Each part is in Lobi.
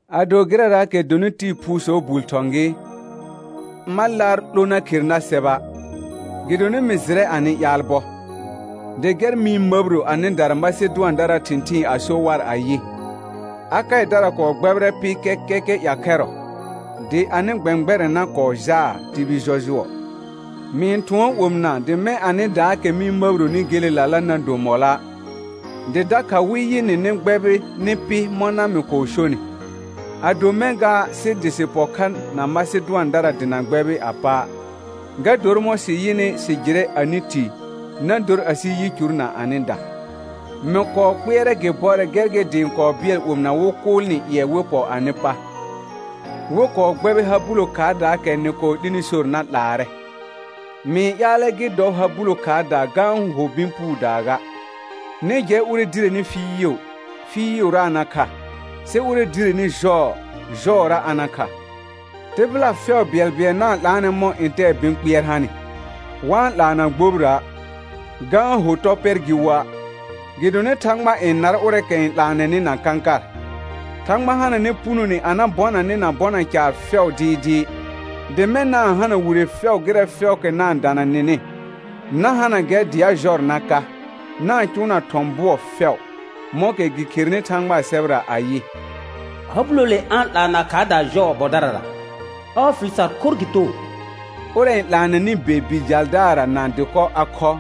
Ado gɩrɛraakɛ dɔnɩ tɩɩ phuusɔɔ bul thɔ̃ gɩ, ma laar 'lo na khere nar sɛba'. Gɩdonɩ mɩ jɩrɛ anɩ ƴaal bɔ, dɩ gɛr mɩ-n məbiro anɩdara Masedʋandaraa thɩ̃thɩɩn a so war ayɩ: Akaɩdara kɔɔ gbɛbɩrɛ pɩ kɛkɛkɛ ƴakhɛrɔ. Dɩ anɩ gbɛ̃gbɛrɛna kɔɔ jaa tibil jɔjʋɔ. Mɩ-n thʋɔn omɩna dɩ mɛ̃ anɩdaakɛ mɩ-n məbironi gelelala na do mɔlɔa', dɩ dakha wɩ yɩ nɩ nɩ gbɛbɩrɩ nɩ pɩ mɔna mɩ kɔɔ sonɩ. Ado mɛ̃ ga, sɩ dɩ sɩ pɔ kha na Masedʋandara dɩ na gbɛbɩ a pa', ga dor mɔ̃ sɩ yɩnɩ sɩ jɩrɛ anɩ ti, na dor asɩ yicur na anɩda. Mɩ kɔɔ kpɩɛrɛ gɩ bɔrɛ gɛr gɩ dɩ ɩ̃ kɔɔ bɩɛl omɩna wɩ kʋʋl nɩ ƴɩɛ wɩ pɔ anɩ pa, wɩ kɔɔ gbɛbɩ ha bulo khaardaakɛ nɩ kɔɔ 'lini sor na 'laarɛ; mɩ-n ƴaalɛ gɩ dɔ ha bulo khaardaa ga-n ho bɩ̃ puudaa ga. Nɩ jɛ ʋrɛ direni fɩɩʋ, fɩɩʋra a na kha, sɩ ʋrɛ direni jɔɔ, jɔɔra a na kha. Tɩbɩla fɛʋ bɩɛlbɩɛl na-n 'laanɛ mɔ̃ ntɛɛ bɩ̃ kpɩɛr hanɩ, wa-n 'laa na gbobira', ga-n ho tɔ pɛr gɩ woa'; gɩdonɩ Thãgba n nar ʋrɛɛkɛ n 'laanɛnɩ na kãkar. Thãgba hananɛ punone a na bɔna nɩ na bɔna caar fɛʋ dɩɩdɩɩ, dɩ mɛ̃ na-n hana wire fɛʋ gɩrɛ fɛʋʋkɛ na-n dana nɩnɩ, na hana gɛr dɩ a jɔr na ka, na-n cʋʋna thɔ̃ bʋɔ fɛʋ, mɔ̃kɛ gɩ kherenɩ Thãgbaa sɛbɛra ayɩ: «Ha bulole a-n 'laana khaardaa jɔɔ bɔdarara, ɔɔ fɩl sar khorr gɩ too.» Ʋrɛ n 'laanɛnɩ be bi jaldaarra na dɩkɔ a khɔ,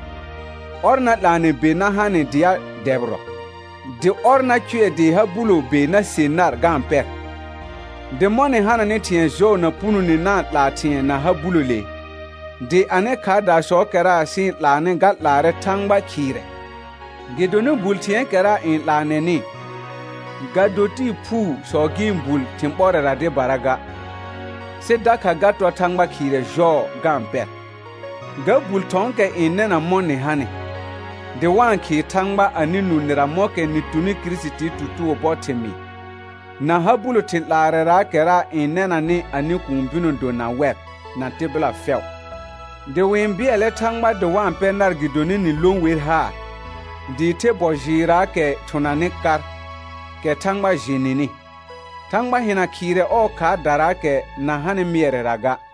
ɔr na 'laanɛ be na ha nɩ dɩ a dɛbɩrɔ, dɩ ɔr na cʋɛ dɩ ha bulo be na se nar ga-n pɛr. Dɩ mɔ̃ nɩ hananɩ thɩ̃ɛ jɔɔ na punone na-n 'laa thɩ̃ɛ na ha bulole, dɩ anɩ khaardasɔɔkɛra sɩ-n 'laanɩ ga 'laarɛ Thãgba khɩɩrɛ. Gɩdonɩ bul thɩ̃ɛɛkɛra n 'laanɛnɩ, ga do tɩɩ phuusɔ gɩ-n bul thɩ̃ ɓɔrɛra dɩbara ga, sɩ dakha ga tɔr Thãgba khɩɩrɛ jɔɔ ga-n pɛr. Ga bul thɔ̃ɔkɛ n nɛna mɔ̃ nɩ hanɩ, dɩ wa-n khɩɩ Thãgba anɩ nũ nɩra mɔ̃kɛ nɩ tuni Kirisitii tutugo bɔ thɩmɩɩ, na ha bulo thɩ̃ 'laarɛraakɛra n nɛnanɩ anɩ kũu bɩnɔ do na wɛr, na tɩbɩla fɛʋ. Dɩ wɩ-n bɩɛlɛ Thãgba dɩ wa-n pɛ nar gɩdonɩ nɩ lõ wer haar, dɩɩ the bɔ jɩɩrraakɛ thʋnanɩ kar, kɛ Thãgba jɩ nɩnɩ. Thãgba hɩna khɩɩrɛ ɔɔ khaardaraakɛ na hanɩ mɩɛrɛra ga.